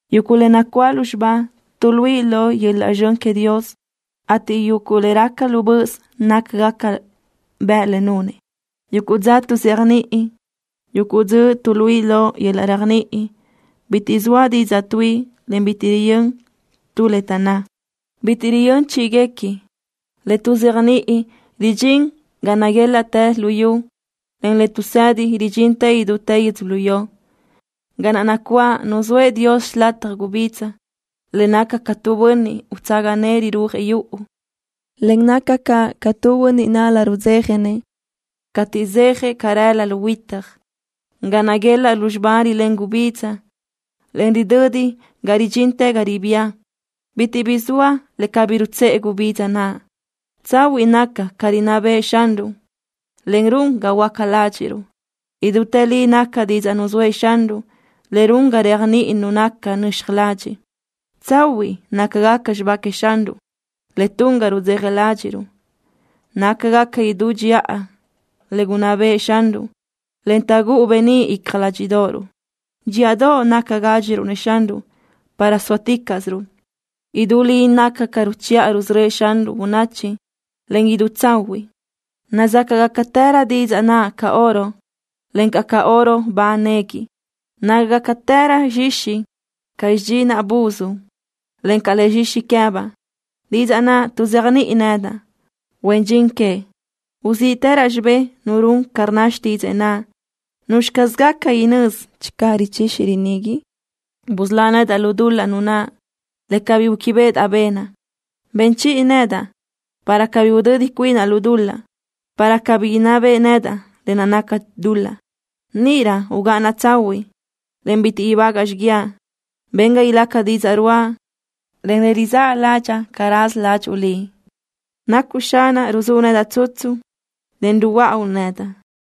Yuguʼ le nacuáʼ lúzxiba tuʼluíʼi lo yöl-laʼ zxön queëʼ Dios, ateʼ yuguʼ le raca lu böʼös nácagaca bëʼ le nunëʼ. Yuguʼ dza tuʼzéajniʼi, en yuguʼ dzöʼ tuʼluíʼi lo yöl-laʼ réajniʼi. Bitiʼ zoa didzaʼ tuíʼi, en bitiʼ riyö́n tu le taʼnná. Bitiʼ riyö́n chíʼiguequi. Le tuʼzéajniʼi ridxín ga naguélaʼtë luyú, en le tuʼsedi ridxín idútë yödzölió. Ga naʼ nacuáʼ nuzóëʼ Dios xilataj gubidza, le naca ca tu bönniʼ utsaga nëʼë rirúajëʼ yuʼu, en naca caʼ ca tu bönniʼ nál-la rudzéjanëʼ cateʼ zéajëʼ carelö lu huitaj. Ga naguelaʼ lúzxiba rilén gubidza, en ridödi ga ridxintë ga ribía. Bitiʼ bi zoa le cabí rutsëʼe gubidza naʼ. Tsahuiʼ naca ca rinná bëʼë Xanruʼ, en run ga huöáca ládxiʼruʼ. Idútë li naca didzaʼ nuzóëʼ Xanruʼ, le run ga réajniʼi nu naca nöxaj ladxiʼ. Tsahuiʼ nácagaca xibá queëʼ Xanruʼ, le tun ga rudzeja ládxiʼruʼ. Nácagaca idú dxiʼa le gunná bëʼë Xanruʼ, en taʼgúʼu beníʼ icja ládxiʼdoʼoruʼ. Dxíʼadoʼ naca gádxiruʼ-nëʼ Xanruʼ, para sóaticaʼsiruʼ. Idú li naca ca ruchiʼa rusörö́ëʼ Xanruʼ bönachi, en idú tsahuiʼ. Nazácaʼgacatërö didzaʼ naʼ ca oro, encaʼ ca oro ba nequi. Nácagacatërö zxixi ca bidxinaʼ buz, en ca le zxixi queë́baʼ. Didzaʼ naʼ tuʼzéajniʼi nedaʼ, huen dxin queëʼ. Uzíʼtërö xibé nu run ca rnna xtídzëʼë naʼ. ¿Nuzxi caz gaca inö́z channö richixi rinigui? Busölá nedaʼ lu dul-laʼ nunaʼ le cabí gúquibeʼedaʼ benaʼ. Ben chiʼi nedaʼ para cabí udödi cuinaʼ lu dul-laʼ, para cabí inná beʼe nedaʼ lë naʼ naca dul-laʼ. Níʼirö ugáʼanaʼ tsahuiʼ, en bitiʼ ibágaʼa xiguiaʼ. Ben ga ilaca didzaʼ ruáʼa, en le rizáʼ ládxaʼa ca raza ládxuʼu Liʼ. Nacuʼ Xanaʼ ruzúʼ nedaʼ tsutsu, en ruhuöáʼauʼ nedaʼ.